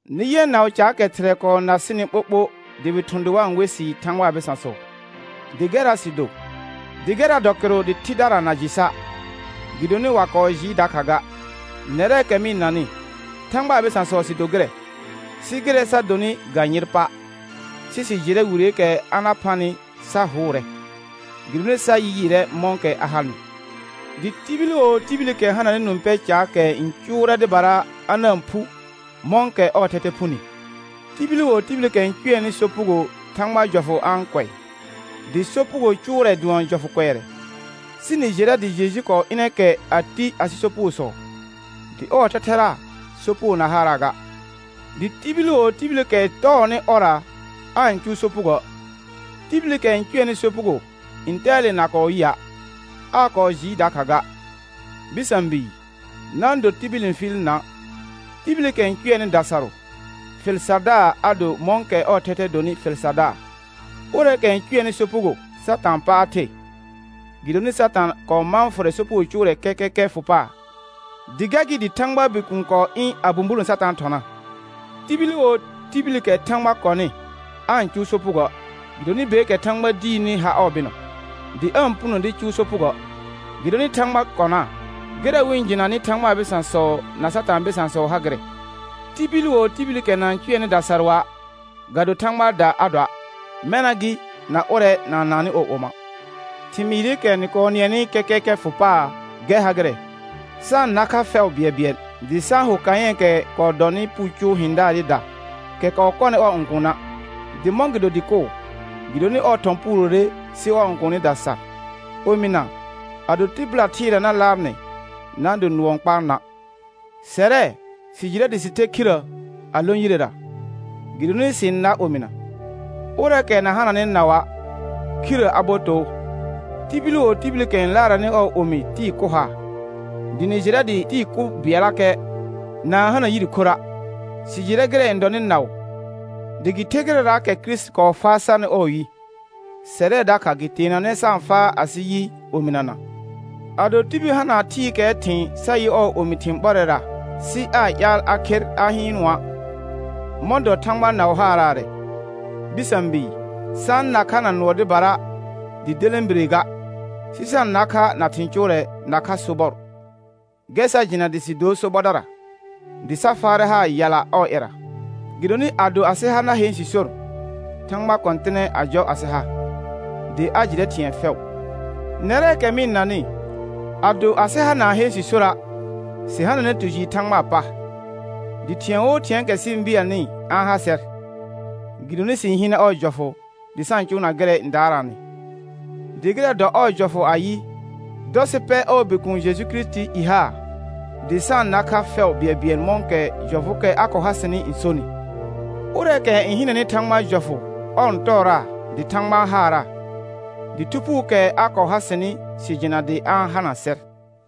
Nɩ yɛ naʋ caakɛ Thɩrɛ kɔɔ na sɩnɩ ɓoɓo dɩ wɩ thʋ̃ dɩ wa-n we sɩ Thãgbaa bɩsãsɔ, dɩ gɛrra sɩ do. Dɩ gɛrra dɔ kɩrʋ dɩ thɩdara na jɩ sa', gɩdonɩ wa kɔɔ jɩɩ dakha ga. Nɛrɛɛkɛ mɩ-n nanɩ, Thãgbaa bɩsãsɔ sɩ do gɩrɛ, sɩ gɩrɛ sa donɩ ga yɩr pa'; sɩ sɩ jɩrɛ wireekɛ a na phanɩ sa hʋʋrɛ, gɩdonɩ sa yɩɩrɛ mɔ̃kɛ a hanɩ. Dɩ tibil wo tibilikɛ hananɩ nũ pɛ caakɛ n cʋʋrɛ dɩbara a na-n phu mɔ̃kɛ ɔɔ thɛthɛ phuni. Tibil wo tibilikɛ n cʋɛnɩ sopugo Thãgbaa jɔfʋ a-n kʋɛ, dɩ sopugo cʋʋrɛ dʋɔn jɔfʋ kʋɛrɛ. Sɩ nɩ jɩrɛ dɩ Jeju kɔɔ ɩnɛ kɛ a ti asɩ sopugosɔ, dɩ ɔɔ thɛthɛra sopugo na haaraa ga. Dɩ tibil wo tibilikɛ tɔɔnɩ ɔrra aa-n cʋʋ sopugoə'; tibilikɛ n cʋɛnɩ sopugo ntɛɛle na kɔɔ yɩa', aa kɔɔ jɩɩ dakha ga. Bɩsã bii, na-n do tibil n fɩɩl na'; tibilikɛ n cʋɛnɩ dasarʋ, fɩl sardaar a do mɔ̃kɛ ɔɔ thɛthɛ donɩ fɩl sardaar. Ʋrɛɛkɛ n cʋɛnɩ sopugo Satãa pa a the, gɩdonɩ Satã kɔɔ mãa fʋrɛ sopugo cʋʋrɛ kɛkɛkɛ fʋ paar, dɩ gɛr gɩ dɩ Thãgbaa Bikuun kɔɔ ɩ̃ a bũburõ Satãa thɔna. Tibil wo tibilikɛ Thãgba kɔnɩ aa-n cʋʋ sopugoə', gɩdonɩ beekɛ Thãgba diirni har ɔɔ bɩnɔ, dɩ aa-n puno dɩ cʋʋ sopugoə', gɩdonɩ Thãgba kɔnaa. Gɩrɛ wɩ-n jɩnanɩ Thãgbaa bɩsãsɔ na Satãa bɩsãsɔ ha gɩrɛ: Tibil wo tibilikɛ na-n cʋɛnɩ dasarʋa', ga do Thãgbaada a doa', mɛna gɩ na ʋrɛ na-n naannɩ ɔɔ oma'. Thɩmɩɩrɩkɛ nɩ kɔɔ nɩɛnɩ kɛkɛkɛ fʋ paar gɛr ha gɩrɛ: Sa-n na kha fɛʋ bɩɛlbɩɛl. Dɩ sa-n ho Kayɛ̃ɛkɛ kɔɔ dɔnɩ puu cʋʋ hɩ̃daarɩda, kɛ kɔɔ kɔnɩ ɔɔ õkuuna'. Dɩ mɔ̃gɩdo dɩ kʋʋ? Gɩdonɩ ɔɔ thɔ̃ puurore sɩ ɔɔ õkuunida sar. Omɩna ado tɩbɩla thɩɩra na laar nɩ, na-n do nʋɔ n kpaa na'. Sɛrɛ sɩ jɩrɛ dɩ sɩ ther khirrə a lõ yirera, gɩdonɩ sɩ-n nar omɩna; ʋrɛɛkɛ na hananɩ naʋa', khirrə a bo too. Tibil wo tibilikɛ n laarɛnɩ ɔɔ omi tɩɩ kʋ haa, dɩ nɩ jɩrɛ dɩ tɩɩ kʋ bɩɛllakɛ na-n hana yire khorra'. Sɩ jɩrɛ gɩrɛ n dɔnɩ naʋ, dɩ gɩ ther gɩrɛraakɛ Kirisiti kɔɔ faa sarnɩ ɔɔ yi, sɛrɛ dakha gɩ teenanɛ sa-n faa asɩ yi omɩnana. Ado tibil hana thɩɩkɛɛ thɩ̃ sa yɩ ɔɔ omi thɩ̃ ɓɔrɛra sɩ aa ƴaal a kher a hɩɩnʋa', mɔ̃ dɔ Thãgba naʋ haaraarɛ? Bɩsã bii, sa-n na kha na nʋɔ dɩbara dɩ delẽbire ga, sɩ sa-n na kha na thɩ̃ cʋʋrɛ nakha sobɔr. Gɛr sa jɩna dɩ sɩ dor sobɔdara, dɩ sa faarɛ haar yala ɔɔ ƴɛra. Gɩdonɩ ado asɩ ha na heen sɩ sor, Thãgba kɔ̃tɩnɛ a jɔ asɩ ha, dɩ a jɩrɛ thɩ̃ɛ fɛʋ. Nɛrɛɛkɛ mɩ-n nanɩ, ado asɩ ha na-n heen sɩ sora', sɩ hananɛ tu jɩɩr Thãgbaa pa, dɩ thɩ̃ɛ wo thɩ̃ɛɛkɛ sɩ-n bɩɛlnɩ a-n ha sɛr, gɩdonɩ sɩ-n hɩɩnɛ ɔɔ jɔfʋ dɩ sa-n cʋʋna gɩrɛ n daaraanɩ. Dɩ gɩrɛ dɔ ɔɔ jɔfʋ ayɩ: Dɔ sɩ pɛr ɔɔ Bikuun Jeju Kirisitii i haar dɩ sa-n na kha fɛʋ bɩɛlbɩɛl mɔ̃kɛ jɔfʋʋkɛ a kɔɔ ha sɩnɩ n sonɩ. Ʋrɛɛkɛ n hɩnɛnɩ Thãgbaa jɔfʋ ɔr n tɔɔraa dɩ Thãgba n haaraa; dɩ Thu Phuukɛ a kɔɔ ha sɩnɩ sɩ jɩna dɩ a-n hana sɛr.